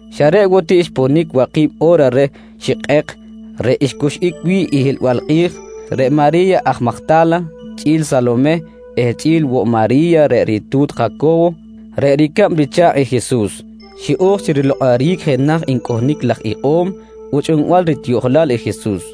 Xa reꞌ woꞌ ti xponic waki̱b o̱ra reh xikꞌek reꞌ ncuxꞌic wi̱ꞌ i hiꞌlbal kꞌi̱j, reꞌ Mari̱ya aj Majta̱la, chꞌi̱l Salomeh eh chꞌi̱l woꞌ Mari̱ya reꞌ ritu̱t Jaco̱wo reꞌ ricab richa̱kꞌ i Jesus, xiꞌo̱j chi rilokꞌoric jenaj ncꞌohnic laj ikꞌo̱m buchꞌbal ritiꞌjolal i Jesus.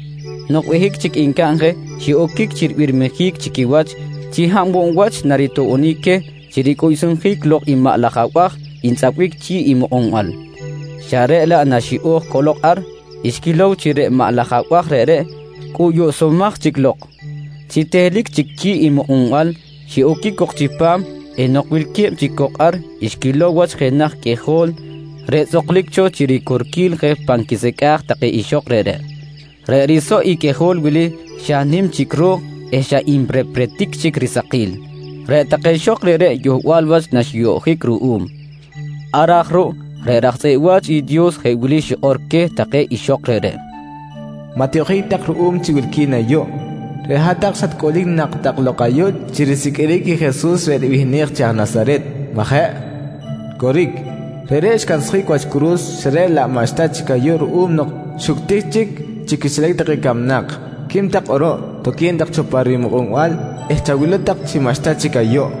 Nok behic chic ncaꞌn je, xiꞌoquic chi ribirmijic chi quiwach chi hab woꞌ wach naritoꞌbonic queh chi ricꞌuyuꞌsjic lok i maꞌ laj abaj ntzꞌapbic chi̱ꞌ i mukꞌunbal, xa reꞌ laꞌ naxiꞌo̱j cꞌolok ar, xquilow chi reꞌ maꞌ laj abaj reꞌreꞌ cꞌuyuꞌsumaj chic lok. Chi tehlic chic chi̱ꞌ i mukꞌunbal, xiꞌoquic cok chipam eh nok wilque̱b chic cok ar xquilow wach jenaj qꞌuijol reꞌ tzꞌuklic cho chi ricorquil je pan quisecꞌa̱j take ixok reꞌreꞌ. Reꞌ risoꞌ i qꞌuijol wili xa nim chic ro̱k eh xa nrepretic chic risakil. Reꞌ take ixok reꞌreꞌ yohbal wach naxiyoꞌjic ruꞌum. Ar aj ruꞌ, reꞌ raj tzꞌeꞌ wa̱ch i Dios jeꞌ wili xikꞌor queh take ixok reꞌreꞌ: «Maꞌ tiyoꞌjic tak ruꞌum chi wilqui̱n ayuꞌ. Reꞌ hat-tak xatcꞌulic nak tak lok ayuꞌ chi risiqꞌuiric i Jesus reꞌ ribihnej chi aj Nasaret, majeꞌ? Coric, reꞌreꞌ xcansjic wach curu̱s xa reꞌ laꞌ maꞌxta chic ayuꞌ ruꞌum nok xuctic chic chi quixilac take camnak. Quim tak kꞌuruꞌ, toque̱n tak cho pa rimukꞌunbal eh chawilow tak chi maꞌxta chic ayuꞌ.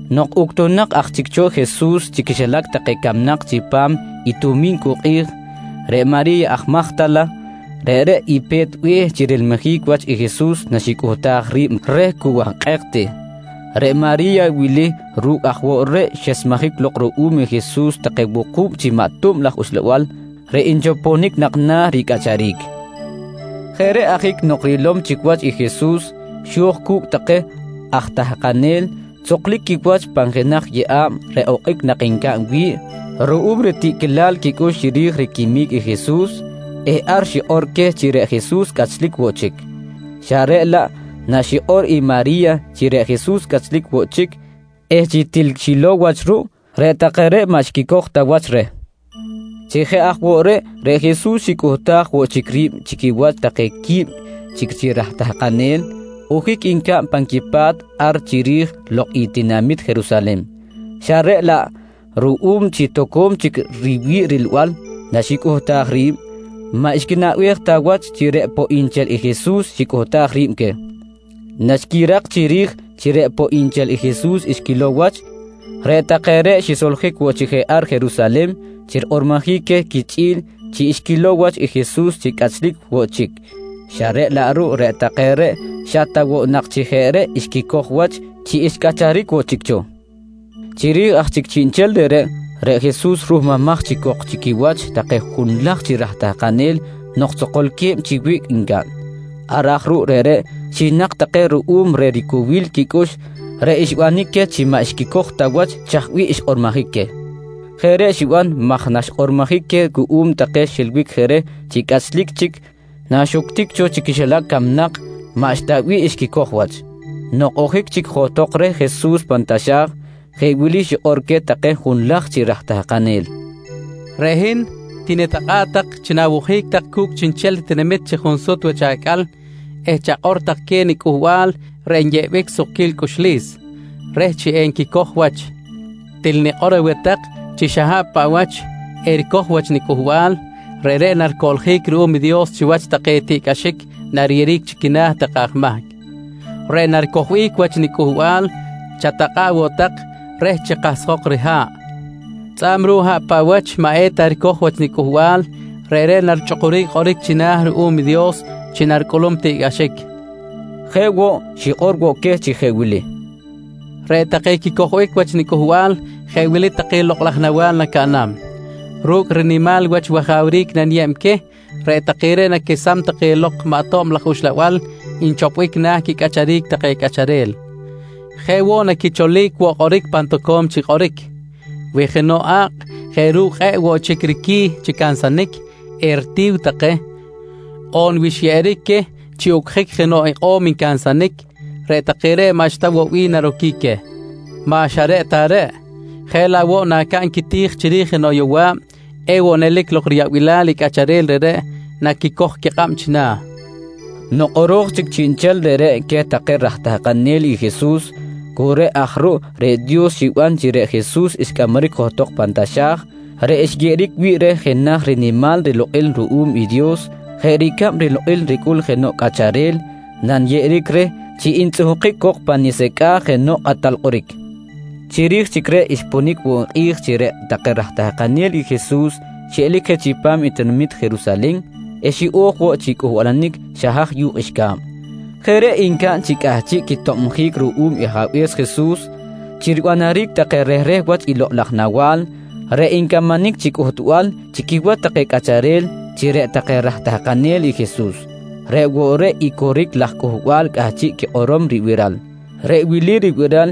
Nok uctunak aj chic cho Jesus chi quixilac take camnak chipam i Tomincuꞌ kꞌi̱j, reꞌ Mari̱ya aj Majta̱la, reꞌreꞌ i pe̱t be̱h chi rilmijic wach i Jesus naxicꞌuhtaj ri̱b reh cu wahkꞌek ti. Reꞌ Mari̱ya wili ru̱cꞌ aj woꞌ reꞌ xesmejic lok ruꞌum i Jesus take wuku̱b chi maꞌ tob laj uxlabal reꞌ nchoponic nak na̱ ricꞌacharic. Jeꞌ reꞌ ajic nok rilom chic wach i Jesus, xo̱j cu̱cꞌ take aj tahkanel tzoklic quiwach pan jenaj yeꞌa̱b reꞌ okꞌic nak ncaꞌn wi̱ꞌ ruꞌum ritiꞌquilal quicꞌux chiri̱j riquimic i Jesus eh ar xikꞌor queh chi reꞌ Jesus cꞌachlic woꞌ chic, xa reꞌ laꞌ naxikꞌor i Mari̱ya chi reꞌ Jesus cꞌachlic woꞌ chic eh chi til xilow wach ruꞌ, reꞌ take reꞌ maꞌ xquicoj ta wach reh. Chi jeꞌ aj woꞌ reꞌ, reꞌ Jesus xicꞌuhtaj woꞌ chic ri̱b chi quiwach take qui̱b chic chi raj tahkanel ojic ncaꞌn pan quipa̱t ar chiri̱j lok i tinamit Jerusalen, xa reꞌ laꞌ, ruꞌum chi toco̱m chic riwi̱ꞌ rilbal naxicꞌuhtaj ri̱b, maꞌ xquinaꞌbej ta wach chi reꞌ poꞌ nchel i Jesus xicꞌuhtaj ri̱b queh. Naxquirak chiri̱j chi reꞌ poꞌ nchel i Jesus xquilow wach, reꞌ take reꞌ xisoljic woꞌ chic je ar Jerusalen chi rikꞌormojic queh quichꞌi̱l chi xquilow wach i Jesus chi cꞌachlic woꞌ chic, xa reꞌ laꞌ ruꞌ reꞌ take reꞌ xa ta woꞌ nak chi jeꞌ reꞌ xquicoj wach chi xcꞌacharic woꞌ chic cho. Chiri̱j aj chic chiꞌnchel reꞌreꞌ, reꞌ Jesus ruhmumaj chic cok chi quiwach take junlaj chi raj tahkanel nok tzokolque̱b chi wiꞌc ncaꞌn. Ar aj ruꞌ reꞌreꞌ xinak take ruꞌum reh ricowil quicꞌux reꞌ xbanic queh chi maꞌ xquicoj ta wach chaj bih xkꞌormojic queh. Jeꞌ reꞌ xiban maj naxkꞌormojic queh cuꞌum take xiꞌilbic reh chi cꞌachlic chic naxuctic cho chi quixilac camnak, maꞌxta bih xquicoj wach. Nok ojic chic johtok reh Jesus pan taxa̱j, jeꞌ wili xikꞌor queh take junlaj chi raj tahkanel: «Reꞌ hin tinitakꞌa̱ꞌ tak chi nawojic tak cu̱cꞌ chiꞌnchel tinamit chi junsut wach acꞌal eh chakꞌor tak queh i niCꞌuhbal reꞌ nyeꞌbic sukquil cꞌuxlis, reh chi enquicoj wach. «Til nikꞌor aweh tak chi xa hab paꞌ wach ericoj wach niCꞌuhbal, reꞌreꞌ naricoꞌljic ruꞌum i Dios chiwach i take tiꞌcꞌaxic nariyeꞌeric chi quina̱ take aj mahc. Reꞌ naricojbic wach niCꞌuhbal, chatakꞌa̱ꞌ woꞌ tak reh chi kahsjok riha̱ꞌ, tzꞌa̱b ruꞌ hab paꞌ wach maꞌ eta ricoj wach niCꞌuhbal, reꞌreꞌ narichꞌukuric kꞌoric china̱ ruꞌum i Dios chi naricꞌulum tiꞌcꞌaxic, nqui queh. Jeꞌ woꞌ, xikꞌor woꞌ queh chi jeꞌ wili: «Reꞌ take quicojbic wach niCꞌuhbal jeꞌ wili take lokꞌ laj nawa̱l nacaꞌnam: Ru̱cꞌ rinimal wach wajawric naniyeb queh, reꞌ take reꞌ naquesam take lok maꞌ tob laj uxlabal nchopbic na̱ quicꞌacharic take cꞌacharel. Jeꞌ woꞌ, naquicholic woꞌ kꞌoric pan toco̱m chic kꞌoric. Wi jenoꞌ a̱kꞌ jeꞌ ru̱cꞌ kꞌe̱ꞌ woꞌ chic riqui̱ chi cansanic, eritiw take on wi xyeꞌeric queh chi ucꞌjic jenoꞌ ikꞌo̱m ncansanic, reꞌ take reꞌ maꞌxta woꞌ wi̱ꞌ naroquic queh. Maꞌ xa reꞌ ta reꞌ, jeꞌ laꞌ woꞌ nacaꞌn quiti̱j chiri̱j jenoꞌ yowa̱b, ewoꞌ nelic lok riyaꞌbilal i cꞌacharel reꞌreꞌ naquicoj i quikꞌab china̱, nqui queh. Nok kꞌoro̱j chic chiꞌnchel reꞌreꞌ queh take raj tahkanel i Jesus, cu reꞌ aj ruꞌ reꞌ Dios xiban chi reꞌ Jesus xcꞌamaric johtok pan taxa̱j reꞌ xyeꞌeric wi̱ꞌ reh jenaj rinimal rilokꞌil ruꞌum i Dios jeꞌ ricab rilokꞌil ricꞌul jenoꞌ cꞌacharel nanyeꞌeric reh chi ntzꞌuhkic cok pa nisecꞌa̱j jenoꞌ kꞌatal kꞌoric. Chiri̱j chic reꞌ xponic woꞌ kꞌi̱j chi reꞌ take raj tahkanel i Jesus xiꞌelic je chipam tinamit Jerusalen eh xiꞌo̱j woꞌ chi cꞌuhbalanic xa haj yu̱kꞌ qꞌuixca̱b. Jeꞌ reꞌ ncaꞌn chi cꞌahchiꞌ quitobjic ruꞌum i Ajabe̱s Jesus chi ribanaric take rehreh wach i lokꞌ laj nawa̱l reꞌ ncamanic chi cꞌuhtbal chi quiwach take cꞌacharel chi reꞌ take raj tahkanel i Jesus, reꞌ woꞌ i coric laj cꞌuhbal cꞌahchiꞌ quikꞌorom ribiral. Reꞌ wili ribiral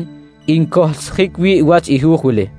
ncohlsjic wi̱ꞌ wach i hu̱j wili.